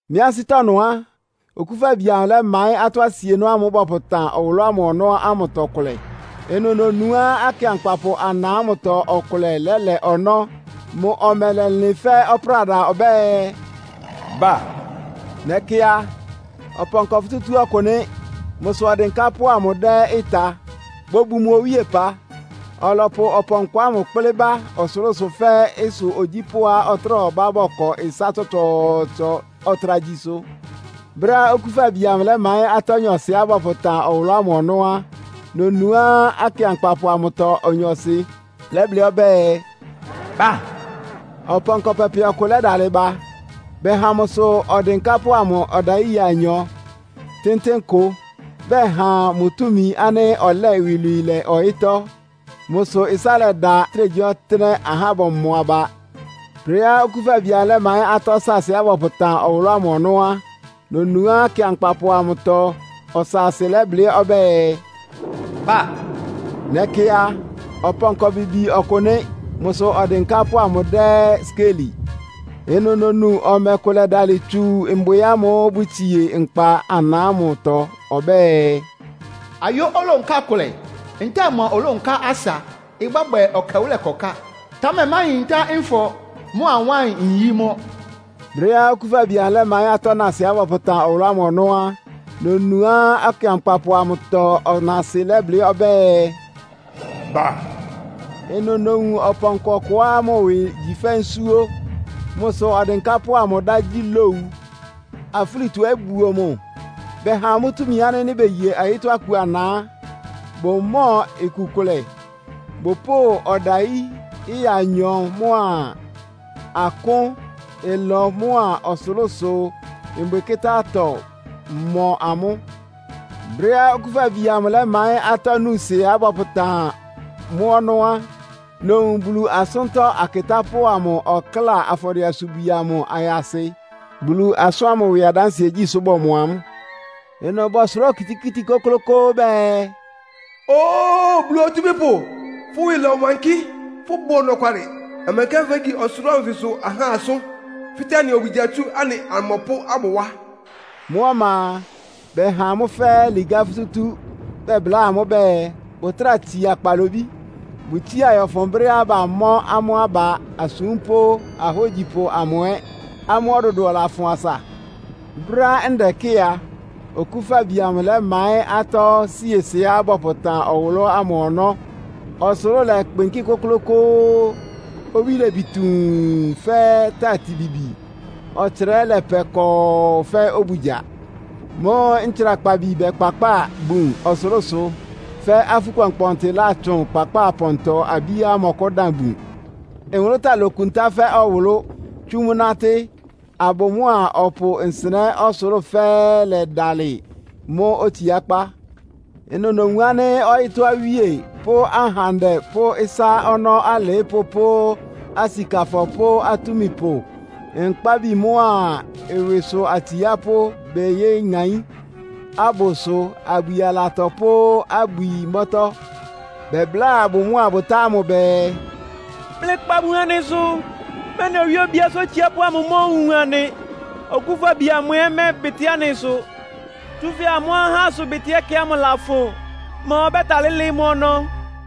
Mɩ́ ansɩ́tɔ́ ɩnʋ á, Okúfabi amʋ lɛ́maɩ́n atɔ́ asienɔ́ ámʋ́ʋ́ bɔpʋtan ɔwʋlʋ́ ámʋ ɔnɔ́ ámʋtɔ kʋlɛ. Ɩnʋ nonuá akɩankpapʋ ana ámʋtɔ ɔkʋlɛ lɛ́lɛ ɔnɔ́. Mʋ ɔmɛ lɛlɩn fɛ́ ɔpráda ɔbɛ́ɛ, “Ba!” Nɛkɩ a, ɔpɔnkɔ futútú ɔkʋ nɩ́. Mʋsʋ odɩnkápʋ́ amʋ dɛ́ ɩta, bobun mʋ owíepa. Ɔlɔpʋ ɔpɔnkɔ ámʋ kplɩ́ ba ɔsʋlʋ́sʋ fɛ́ ɩsʋ ogyípʋ́á ɔtráa ɔbá bɔkɔ ɩsá tsɔtsɔɔtsɔ, ɔtra gyi ɩsʋ. Brɛ́á Okúfabi amʋ lɛ́maɩ́n atɔ́ nyɔɔsɩá bɔpʋtan ɔwʋlʋ́ ámʋ ɔnɔ́ á, nonuá akɩankpapʋ amʋtɔ onyɔɔsɩ lɛ́blɩ́ ɔbɛ́ɛ, “Ba!” Ɔpɔnkɔ pɛpɛ ɔkʋ lɛ́dalɩ ba. Bɛha mʋsʋ ɔdɩnkápʋ́ ɔdayí ɩya anyɔ tɩ́ntɩ́n kʋ. Bɛha mʋ túmi ánɩ́ ɔlɛ́ɛ iwilwii lɛ ɔyɩ́tɔ́. Mʋ́ sʋ ɩsá lɛda ɔtɩ́nɛgyíɔtɩ́nɛ́, ahá bɔmɔ aba. Brɛ́á Okúfabi amʋ lɛ́maɩ́n atɔ́ saasɩá bɔpʋtan ɔwʋlʋ́ ámʋ ɔnɔ́ á, nonuá akɩankpapʋ amʋtɔ ɔsaasɩ lɛ́blɩ́ ɔbɛ́ɛ, “Ba!” Nɛkɩ a, ɔpɔnkɔ bibi ɔkʋ nɩ́. Mʋsʋ ɔdɩnkápʋ́ amʋ dɛ́ skéeli. Ɩnʋ nonu ɔmɛ kʋ lɛ́dalɩ tsu mbwɩ ámʋ́ʋ́ bʋtsie nkpa ana ámʋtɔ ɔbɛ́ɛ, “Ayó olónká kʋlɛ ntɛ́ɛ ɩmɔ olónká asa ɩbɔ́bwɛ ɛkɛwʋ́lɛ ɩkɔká. Támɛ máyintá nfɔ mʋ́a wáɩn-nyí mʋ́.” Brɛ́á Okúfabi amʋ lɛ́maɩ́n atɔ́ naasɩá bɔpʋtan ɔwʋlʋ́ ámʋ ɔnɔ́ á, nonuá akɩankpapʋ amʋtɔ ɔnaasɩ lɛ́blɩ́ ɔbɛ́ɛ, “Ba!” Ɩnʋ nowun ɔpɔnkɔ ɔkʋá mʋ ɩwɩ igyi fɛ́ nsúó. Mʋsʋ ɔdɩnkápʋ́ amʋ ɩdá gyí Lowu. Afúlitɔ ɛ́ buo mʋ. Bɛha amʋ́ túmi ánɩ́ nɩ́ beye ɔyɩ́tɔ́ aku ana á, bʋmɔ́ɔ iku kʋlɛ. Bʋpʋ́ʋ ɔdayí ɩya anyɔ mʋ́a akʋ́n, ɩlɔ mʋ́a ɔsʋlʋ́sʋ mbwɩkɩ́tá-atɔ mɔ amʋ́. Brɛ́á Okúfabi amʋ lɛ́maɩ́n atɔ́ nuusɩá bɔpʋtan mʋ́ ɔnɔ́ á, nowun Bulu asʋ́ntɔ́ akɩtápʋ́ amʋ ɔkláa afɔdɩɛ-asubwi amʋ ayasɩ. Bulu asʋ́n ámʋ ɩwɩ adánsɩɛ gyí sʋ bɔmɔ amʋ́. Ɩnʋ bɔsʋrá okitikíti kʋ́klʋ́kʋ́ʋ́ bɛɛ, “Óo! Bulu Otúmípʋ, fʋ́ ɩwɩ lɔwankɩ́, fʋ́bʋ ɔnɔkwalɩ. Ɔmɛnkɛ fégyi ɔsʋlʋ́ʋ anfɩsʋ ahá asʋ́n, fɩ́tɛ́ anɩ obugya tsú anɩ amɔpʋ́ ámʋ wá?” Mʋ́ ɔma a, bɛha amʋ́ fɛ́ɛ́ ligá futútú, bɛbláa amʋ́ bɛɛ, bʋtráa tsia kpalobí. Bʋtsía yɔ́fʋn brɛ́á bamɔ́ amʋ́ aba asúmpʋ́ ahógyipʋ amʋ ɛ́, amʋ́ ɔdʋdʋɔ lafʋn asa. Brɛ́á ndɛkɩ́ɩ a, Okúfabi amʋ lɛ́maɩ́n atɔ́ siesɩá bɔpʋtan ɔwʋlʋ́ ámʋ ɔnɔ́. Ɔsʋlʋ́ʋ lɛkpɩnkɩ́ kʋ́klʋ́kʋ́ʋ́, owí lebi tuun fɛ́ tati bibi, ɔtsra ɛ́ lɛpɛ kɔɔ fɛ́ obugya. Mʋ́ʋ́ ntsrakpabi bɛkpakpáa bun ɔsʋlʋ́sʋ, fɛ́ afú kpɔnkpɔɔnkpɔntɩ látsʋn kpakpáa pɔntɔ-abíá ɩmɔkʋ́dan bun. Nwʋlʋ́táa lokuntá fɛ́ ɔwʋlʋ́, tsú mʋ́ nátɩ́. Abʋ mʋ́a ɔpʋ nsɩnɛ́ ɔsʋlʋ́ʋ fɛ́ɛ́ lɛdalɩ mʋ́ otsiákpá. Ɩnʋ nowun ánɩ́ ɔyɩ́tɔ́ awíe pʋ́ ahandɛ pʋ́ ɩsá ɔnɔ́ alɩɩ́pʋ́ pʋ́ asikafɔ pʋ́ atúmipʋ, nkpábi mʋ́a ɩwɩsʋ atsiápʋ́ beyéŋaín abʋsʋ abwi alatɔ pʋ́ abwi mbɔ́tɔ́. Bɛbláa abʋ mʋ́a abʋtá ámʋ bɛɛ, “Mlɩkpa bun anɩsʋ, mɛ́nɩ owíe obíásʋ́ otsiápʋ́ amʋ omóowun anɩ, Okúfabi amʋ ɔmɛ́ɛbɩtɩ́ anɩ ɩsʋ! Tsúfɛ́ amʋ́ ahá ɩsʋbɩtɩ́ ɛkɛ ámʋ lafʋn. Ma ɔbɛ́talɩ́ lɩ́ɩ́ mʋ́ ɔnɔ́?”